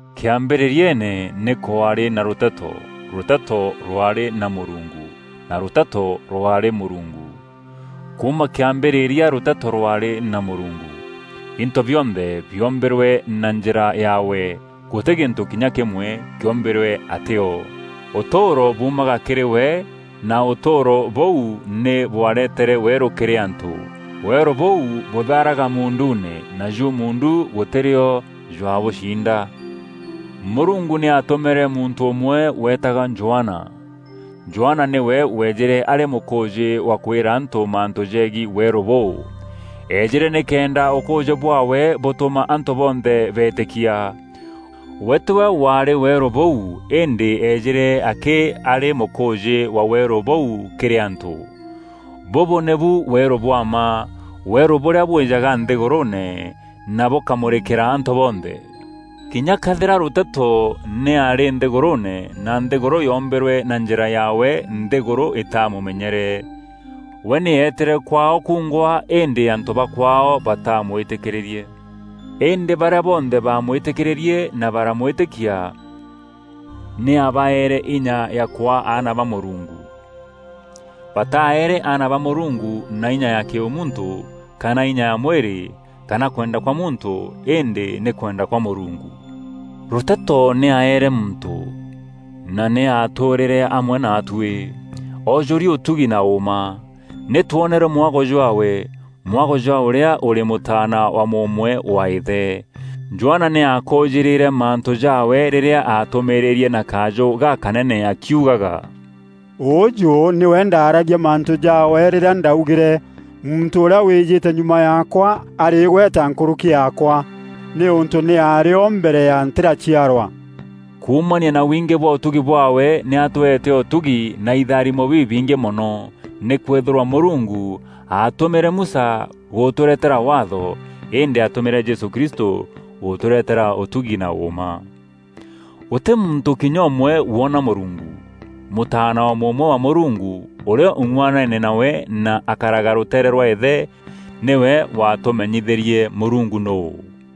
Kîambîrîriene, nî kwaarî na Rûteto; Rûteto rwaarî na Mûrungu; na Rûteto rwaarî Mûrungu. Kuuma kîambîrîria Rûteto rwaarî na Mûrungu. Into bionthe biombîrwe na njîra yaawe; gûtî gîntû kinya kîmwe kîombîrwe atî o. Ûtûûro buumaga kîrî we, na ûtûûro bûu nî bwaretere weerû kîrî antû. Weerû bûu bûthaaraga muunduune, naju muundu gûtî rîo jwaabûciinda. Mûrungu nî aatûmîre muntû ûmwe weetagwa Johana. Johana nîwe weejîre arî mûkûûjî wa kwîra antû mantû jegiî weerû bûu. Eejîre nîkenda ûkûûjî bwaawe bûtûma antû bonthe beetîkia. We tîwe waarî weerû bûu, îndî eejîre akî arî mûkûûjî wa weerû bûu kîrî antû. Bûbû nîbu weerû bwa mma, weerû bûrîa bwîjaga nthîgûrûûne, na bûkamûrîkîra antû bonthe. Kinya këethîra Rûteto nî aarî nthîgûrûûne na nthîgûrû yoombîrwe na njîra yaawe, nthîgûrû îtamûmenyere. We nî eetîre kwaao kungwa, îndî antû ba kwaao batamwîtîkîrîrie. Îndî barîa bonthe baamwîtîkîrîrie na baramwîtîkia, nî aabaeere inya ya kwaa aana ba Mûrungu. Bataeere aana ba Mûrungu na inya ya kîûmuntû, kana inya ya mwîrî, kana kwenda kwa muntû îndî nî kwenda kwa Mûrungu. Rûteto nî aaere muntû, na nî aatûûrîre amwe naatuî, oojûri ûtugi na ûûma. Nî twonere mwago jwaawe; mwago jwa ûrîa ûrî Mûtaana wa mûûmwe wa Îthe. Johana nî aakûûjîrîre mantû jaawe rîrîa aatûmîîrîrie na kajû gakanene akiugaga, “Ûûjû nîwe ndaaragia mantû jaawe rîrîa ndaugîre, ‘Muntû ûrîa wîîjîte nyuma yaakwa arî îgweta nkûrûki yaakwa, nîûntû nî aarî o mbere ya ntîraciarwa.’” Kuumania na wingî bwa ûtugi bwaawe, nî atweete ûtugi na itharimo bibingî mono. Nîkwîthîrwa Mûrungu aatumîîre Musa gûtûretera Waatho, îndî aatumîîre Jesû Kristû gûtûretera ûtugi na ûûma. Gûtî muntû kinya ûmwe woona Mûrungu. Mûtaana wa mûûmwe wa Mûrungu, ûrîa ûng'uanene nawe na akaraga rûteere rwa Îthe, nîwe waatûmenyithîrie Mûrungu nûû.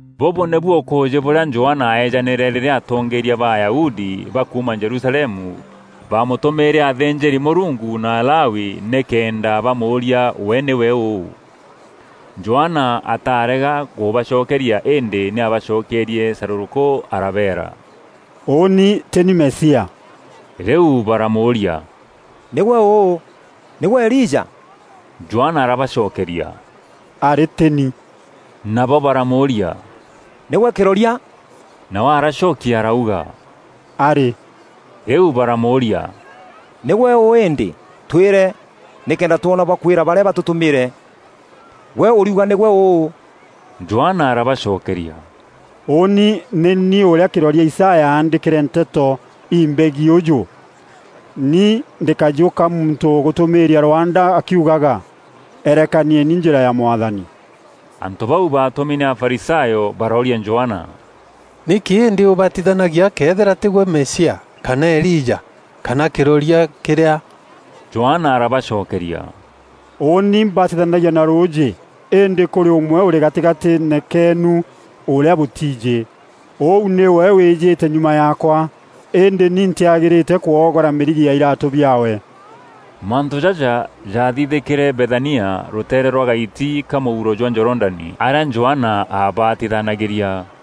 Bûbû nîbu ûkûûjî bûrîa Johana aeejanîre rîrîa atongeeria ba Ayahudi ba kuuma Jerusalemu baamûtûmîîre athînjîri-Mûrungu na Alawi nîkenda bamûûria we nîwe ûû. Johana atarega kûbacokeria îndî nî aabacokerie carûrûkû arabeera, “Ûûni tî ni Mesia.” Rîu baramûûria, “Nîgwe ûû? Nîgwe Elija?” Johana arabacokeria, “Arî, tî ni.” Nabo baramûûria, “Nîgwe kîroria?” Nawe aracokia arauga, “Arî.” Rîu baramûûria, “Nîgwe ûû îndî? Twîre, nîkenda twona bwa kwîra barîa batûtûmîre. Gwe ûriuga nîgwe ûû?” Johana arabacokeria, “Ûûni nî ni ûrîa kîroria Isaya aandîkîre nteto imbegiî ûjû: ‘Ni ndî kajû ka muntû ûgûtûmîîria rwanda akiugaga; Erekanieni njîra ya Mwathani.’” Antû bau baatûmi nî Afarisayo barooria Johana, “Nîkî îndî ûbatithanagia këethîra tîgwe Mesia, kana Elija, kana kîroria kîrîa?” Johana arabacokeria, “Ûûni mbatithanagia na rûûjî, îndî kûrî ûmwe ûrî gatîgatîîne keenu, ûrîa bûtiijî. Ûu nîwe wîjîte nyuma yaakwa, îndî ni ntîagîrîte kwogora mîrigi ya iraatû biaawe.” Mantû jaja jaathithîkîre Bethania, rûtere rwa gaiti ka mûuro jwa Jorodani, arîa Johana aabatithanagîria.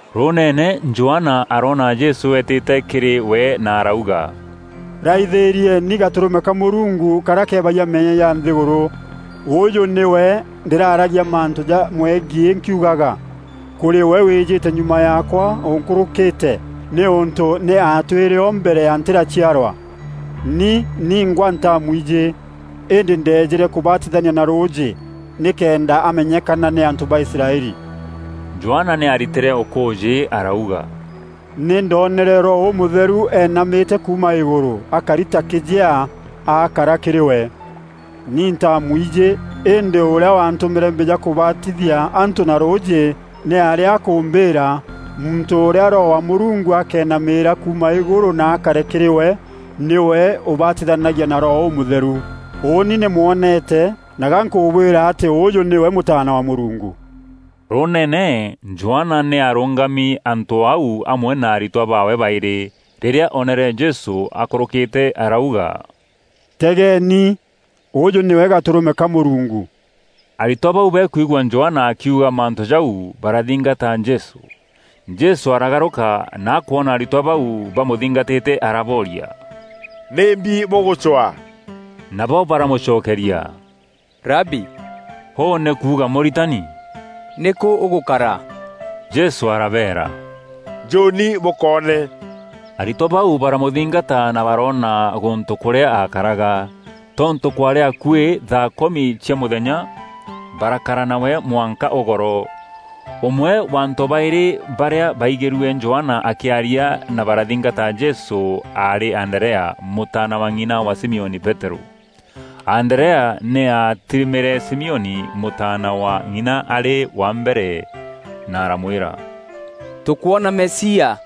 Rûûneene, Johana aroona Jesû eetîte kîrî we na arauga, “Raithîrieni, Gatûrûme ka Mûrungu, karîa kebagia meeyia ja nthîgûrû. Ûûjû nîwe ndîraaragia mantû jamwegiî nkiugaga, ‘Kûrî we wîjîte nyuma yaakwa ûnkûrûkîte, nîûntû nî aatwîre o mbere ya ntîraciarwa!’ Ni ningwa ntaamwijî, îndî ndeejîre kûbatithania na rûûjî nîkenda amenyekana nî antû ba Israeli.” Johana nî aaritîre ûkûûjî arauga, “Nî ndonere Roho Ûmûtheru eenamîte kuuma îgûrû akari ta kîjea akara kîrî we. Ni ntaamwijî, îndî ûrîa waantûmîre mbîja kûbatithia antû na rûûjî nî aarî akûmbîîra, ‘Muntû ûrîa Roho wa Mûrungu akeenamîîra kuuma îgûrû na akare kîrî we, nîwe ûbatithanagia na Roho Ûmûtheru.’ Ûûni nî mwonete na ga nkûbwîra atî ûûjû nîwe Mûtaana wa Mûrungu.” Rûûneene, Johana nî aarûngami antû o au amwe na aritwa baawe baîrî. Rîrîa oonere Jesû akûrûkîte arauga, “Tegeeni! Ûûjû nîwe Gatûrûme ka Mûrungu.” Aritwa bau bakwigua Johana akiuga mantû jau, barathingata Jesû. Jesû aragarûka na akwona aritwa bau bamûthingatîte arabooria, “Nîmbi bûgûcwa?” Nabo baramûcokeria, “Rabi, ûû nî kuuga ‘Mûritani’ nîkû ûgûkara?” Jesû arabeera, “Njûûni bûkoone.” Aritwa bau baramûthingata na baroona gûntû kûrîa akaraga. Tontû kwaarî akuî thaa kûmi cia mûthenya, barakara nawe mwanka ûgoro. Ûmwe wa antû baîrî barîa baigîrue Johana akîaria na barathingata Jesû aarî Anderea, mûtaana wa ng'ina wa Simioni Peterû. Anderea nî aatîrimîre Simioni, mûtaana wa ng'ina arî wa mbere na aramwîra, “Tûkwona Mesia”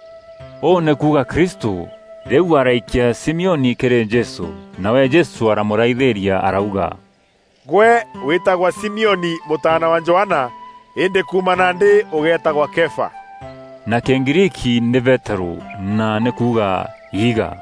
(ûu nî kuuga Kristû). Rîu araikia Simioni kîrî Jesû. Nawe Jesû aramûraithîria arauga, “Gwe wîtagwa Simioni mûtaana wa Johana îndî kuuma nandî ûgeetagwa Kefa” (na Kîgriiki nî Peterû, na nî kuuga “Iiga”).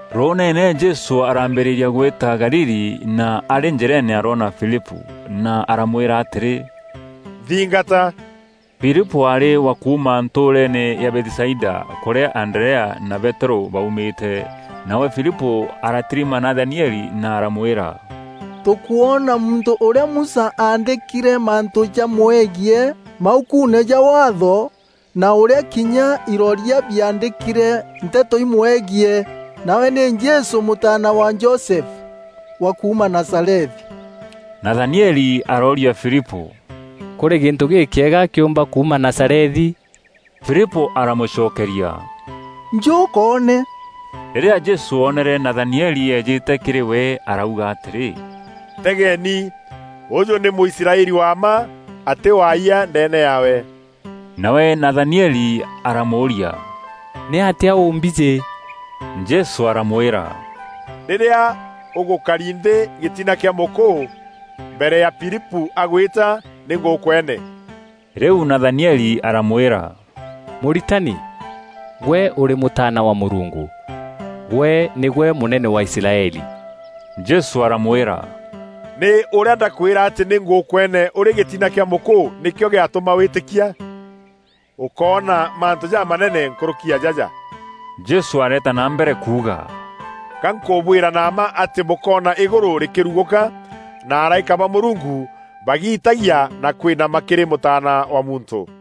Rûûneene Jesû araambîrîria gwîta Galili na arî njîreene aroona Filipû na aramwîra atîrî, “Nthingata.” Filipû aarî wa kuuma ntûûreene ya Bethisaida, kûrîa Anderea na Peterû baûmîte. Nawe Filipû aratirima Nathanieli na aramwîra, “Tûkwona muntû ûrîa Musa aandîkîre mantû jamwegiî maukuune ja Waatho, na ûrîa kinya iroria biaandîkîre nteto imwegiî, nawe nî Jesû mûtaana wa Josefu, wa kuuma Nazarethi.” Nathanieli arooria Filipû, “Kûrî gîntû gîkîega kîûmba kuuma Nazarethi?” Filipû aramûcokeria, “Njû ûkoone.” Rîrîa Jesû oonere Nathanieli eejîte kîrî we, arauga atîrî, “Tegeeni! Ûûjû nî Mûisraeli wa mma; atî waayia ndeene yaawe.” Nawe Nathanieli aramûûria, “Nîatîa ûmbijî?” Jesû aramwîra, “Rîrîa ûgûkari nthî gîtina kîa mûkûû, mbere ya Filipû agwîta, nî ngûkwene.” Rîu Nathanieli aramwîra, “Mûritani, gwe ûrî Mûtaana wa Mûrungu. Gwe nîgwe Mûnene wa Israeli!” Jesû aramwîra, “Nî ûrîa ndakwîra atî nî ngûkwene ûrî gîtina kîa mûkûû nîkîo gîatûma wîtîkia? Ûkoona mantû jamanene nkûrûki ya jaja.” Jesû areeta na mbere kuuga, “Ga nkûbwîra na mma atî bûkoona Îgûrû rîkîrugûka, na araîka ba Mûrungu bagiitagia na kwinama kîrî Mûtaana wa Muntû.”